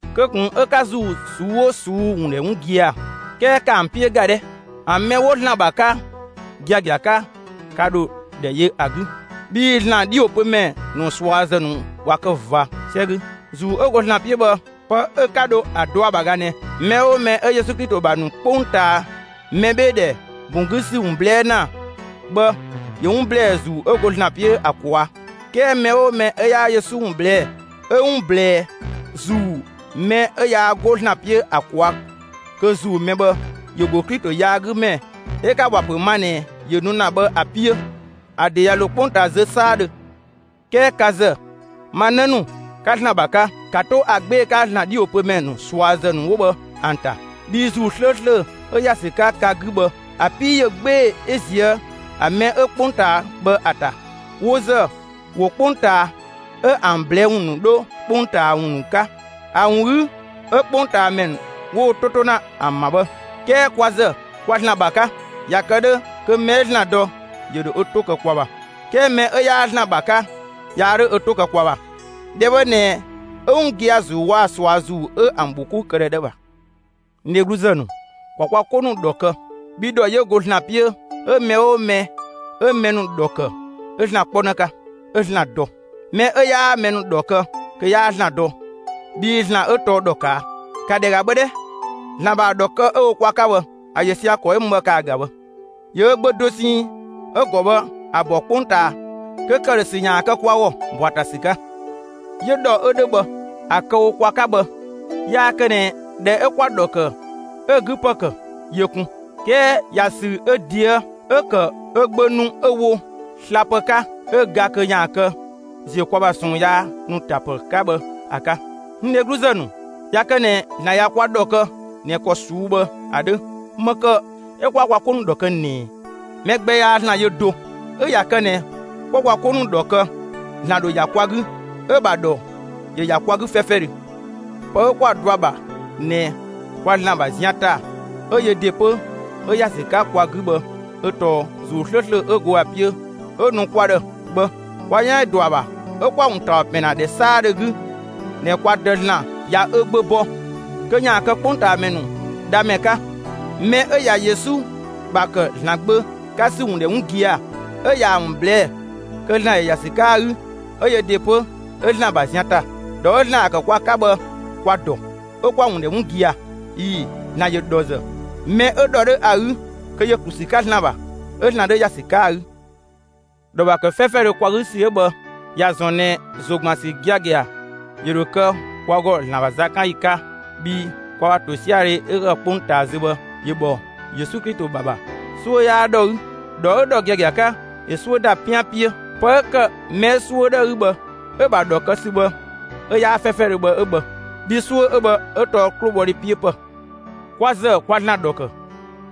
Kö ꞊kun 'ö ka ‑zuu ꞊suu'‑ 'oo ꞊suu'‑ ‑wun ‑dhɛ 'wun gia‑! 'Kɛɛ ‑kaa ‑an 'piö ‑ga 'dhɛ! ‑An mɛ 'wo ‑Zlan ‑bha 'ka giagia 'ka, ka ‑dho ‑dhɛ yö ‑a 'gü. Bhii ‑Zlan 'dhiwopömɛ ‑nu ꞊suazë ‑nu ꞊wa kë ꞊va 'sɛ 'gü. ‑Zuu 'ö go ‑Zlan 'piö bhë, pë 'ö 'ka dho ‑a dɔ ‑a ‑bha ꞊ga ꞊nɛ: Mɛ 'oo mɛ 'ö Yesu Klito ‑bha ‑nu 'kpongtaa mɛbheedhɛ ‑bun 'gü ‑sü ‑wun ꞊blɛɛ' ‑na bhë ‑yö 'wun ‑blɛɛ ‑Zuu 'ö go ‑Zlan 'piö ‑a ꞊kwaa'. 'Kɛɛ mɛ 'oo mɛ 'ö 'yaa Yesu ‑wun ꞊blɛɛ', 'ö 'wun ꞊blɛɛ ‑zuu mɛ 'ö yaa 'go ‑Zlan 'piö ‑a ꞊kwaa' kö ‑zuu mɛ bhë, ‑yö ‑go Klito yaagümɛ 'ö 'ka‑ ‑wa ‑pö ma ꞊nɛ ‑yö nu ‑na bhë ‑a 'piö. ‑A ‑de ꞊ya ‑lo 'kpongtaa zö 'saadhö. 'Kɛɛ ka ‑zë, ma 'në ‑nu, ka ‑Zlan ‑bha 'ka, 'ka 'to ‑a 'gbee‑ 'ka ‑Zlan 'dhiwopömɛ ‑nu ꞊suazë ‑nu 'wo bhë ‑an ‑ta, bhii ‑Zuu 'slööslö 'ö ‑ya ‑sü 'ka ka 'gü bhë, ‑a 'pii ‑yö 'gbee‑ 'ö ꞊zië' ‑a mɛ 'ö 'kpongtaa bhë ‑a ‑ta. Wo ‑zë, ‑wo 'kpongtaa 'ö ‑an ꞊blɛɛ' ‑wun ‑nu 'dho 'kpongtaa ‑wun ‑nu 'ka; ‑a ‑wun 'gü 'ö 'kpongtaamɛ ‑nu 'wo wo 'to 'to ‑na ‑an ‑bha bhë. 'Kɛɛ kwa ‑zë, kwa ‑Zlan ‑bha 'ka. ꞊Ya kë 'dhö kö mɛ 'ö ‑Zlan dɔ ‑yö ‑dho ö 'to kë kwa ‑bha. 'Kɛɛ mɛ 'ö 'yaa ‑Zlan ‑bha 'ka 'yaa ö 'to kë kwa ‑bha. ‑Dhɛ bhë ꞊nɛ 'ö 'wun gia‑ ‑Zuu waa‑ ꞊sua ‑zuu 'ö ‑an ‑bhokoudhɛ 'dhö ‑a ‑bha. N dhegluzë ‑nu, ‑kwa kwa 'ko ‑nu ‑dhɔ kë! Bhii ‑dhɔ ‑yö ‑go ‑Zlan 'piö, 'ö mɛ 'oo mɛ 'ö mɛ ‑nu ‑dhɔ ‑kë 'ö ‑Zlan 'kpɔnë 'ka, 'ö ‑Zlan dɔ. Mɛ 'ö 'yaa mɛ ‑nu ‑dhɔ kë, kö 'yaa ‑Zlan dɔ bhii ‑Zlan 'ö tɔɔ ‑dhɔ ꞊kaa'. ‑Ka ‑dhɛ ‑ga bhë 'dhɛ! ‑Zlan ‑bha ‑a ‑dhɔ kë 'ö‑ wo kwa 'ka bhë, ‑a ‑yö sia‑ ‑kɔ 'ö mü bhë ‑kaa ‑ga bhë: ‑Yö ö Gbö dosɛn 'ö‑ ‑gɔ bhë ‑a ‑bɔ 'kpongtaa kö ‑këdhösü ‑yaan kë kwa ‑gɔ ꞊bɔa' ‑a ‑ta ‑sü 'ka. 'Yö ‑dhɔ 'ö 'dhö bhë, ‑a kë‑ wo kwa 'ka bhë, yaa kë ꞊nɛ ꞊dhɛ 'ö 'kwa‑ ‑dhɔ ‑kë 'ö‑ 'gü ‑pë ‑kë yö kun, 'kɛɛ ‑ya ‑sü ö ꞊deë' 'ö ‑kë ö Gbö nu 'ö‑ wo slapë 'ka 'ö ga kö ‑yaan kë ‑ziö kwa ‑bha ꞊sɔɔn yaa ‑nu ‑ta ‑pë 'ka bhë ‑a 'ka. N dhegluzë ‑nu, ꞊ya kë ꞊nɛ ‑Zlan ꞊ya kwa ‑dhɔ kë ꞊nɛ ‑kɔ ꞊suu'‑ bhë ‑a 'dhö, ‑më ‑kë 'ö 'kwaa kwa 'ko ‑nu ‑dhɔ kë ꞊nɛɛ? Mɛ gbɛ yaa ‑Zlan yö do. 'Ö ꞊ya kë ꞊nɛ 'kwa kwa 'ko ‑nu ‑dhɔ kë, ‑Zlan ‑dho ‑ya kwa 'gü, 'ö‑ ‑bha ‑dhɔ ‑yö ‑ya kwa 'gü 'fɛfɛdhö. Pë 'ö 'kwa‑ dɔa ‑bha ꞊nɛ kwa ‑Zlan ‑bha zian ‑ta 'ö yö ‑de 'pö 'ö ‑ya ‑sü 'ka kwa 'gü bhë 'ö tɔɔ ‑Zuu 'slööslö 'ö go ‑a 'piö 'ö‑ nu kwa ‑dhë bhë. Kwa 'yan ‑yö ‑dɔ ‑a ‑bha 'ö 'kwa‑ ‑wun ‑taɔ ‑pɛn ‑na ‑dhɛ 'saadhö 'gü ꞊nɛ kwa Dë (‑Zlan) ꞊ya ö Gbö bɔ kö ‑yaan kë 'kpongtaamɛ ‑nu Dhamɛ 'ka. Mɛ 'ö ꞊ya Yesu ‑bha ‑kë ‑Zlan Gbö 'ka ‑sü ‑wun ‑dhɛ 'wun gia‑, 'ö ꞊yaa‑ ‑wun ꞊blɛɛ' kö ‑Zlan ‑yö ‑ya ‑sü 'ka ‑a 'gü 'ö yö ‑de 'pö 'ö ‑Zlan ‑bha zian ‑ta. ‑Dhɔ 'ö ‑Zlan ‑ya ‑kë kwa 'ka bhë kwa‑ ‑dɔ, 'ö 'kwa‑ ‑wun ‑dhɛ 'wun gia‑. ꞊Ii‑, ‑Zlan ‑yö ‑dhɔzë; mɛ 'ö ‑dhɔ 'dhö ‑a 'gü kö ‑yö ‑klu ‑sü 'ka ‑Zlan ‑bha 'ö ‑Zlan 'dhö ‑ya ‑sü 'ka ‑a 'gü. ‑Dhɔ ‑bha ‑kë 'fɛfɛdhö kwa 'gü ‑sü 'ö bhë ꞊ya ‑zɔn ꞊nɛ ‑zo ‑gban ‑sü giagia ‑yö ‑dho kë kwa ‑gɔ ‑Zlan ‑bha zakanyi 'ka bhii kwa ‑bha ‑tosiadhe 'ö ‑kë 'kpongtaa zö bhë ‑yö ‑bhɔ Yesu Klito ‑bha ‑bha. 'Suö 'yaa ‑dhɔ 'gü; ‑dhɔ 'ö ‑dhɔ giagia 'ka, ‑yö 'suö ‑da 'pian 'piö. Pë 'ö ‑kë mɛ 'ö 'suö 'dhö ‑a 'gü bhë 'ö‑ ‑bha ‑dhɔ kë ‑sü bhë 'ö 'yaa 'fɛfɛdhö bhë 'ö bhë, bhii 'suö 'ö bhë 'ö tɔɔ 'klobhɔdhe 'piö ‑pë. Kwa ‑zë kwa ‑Zlan ‑dhɔ ‑kë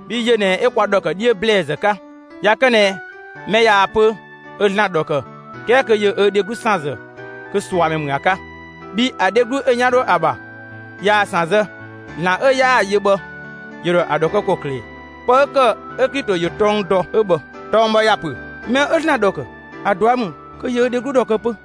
bhii yö ꞊nɛ 'ö kwa ‑dhɔ ‑kë 'dhiö ‑blɛɛzë 'ka. ꞊Ya kë ꞊nɛ mɛ ꞊yaa‑ pö ö ‑Zlan ‑dhɔ ‑kë 'kɛɛ kö ‑yö ö dheglu ‑san ‑zë kö ꞊suamɛ ‑mü ‑a 'ka; bhii ‑a dheglu 'ö‑ 'yan 'dho ‑a ‑bha ꞊yaa‑ ‑san zë, ‑Zlan 'ö 'yaa‑ yö bhë ‑yö ‑dho ‑a ‑dhɔ kë ‑kɔklë ꞊ɛ? Pë 'ö ‑kë 'ö Klito ‑yö tɔng dɔ 'ö bhë. Tɔng bhë ‑ya ‑pö: Mɛ 'ö ‑Zlan ‑dhɔ ‑kë, ‑a ꞊dua' ‑mü kö ‑yö ö dheglu ‑dhɔ kë 'pö.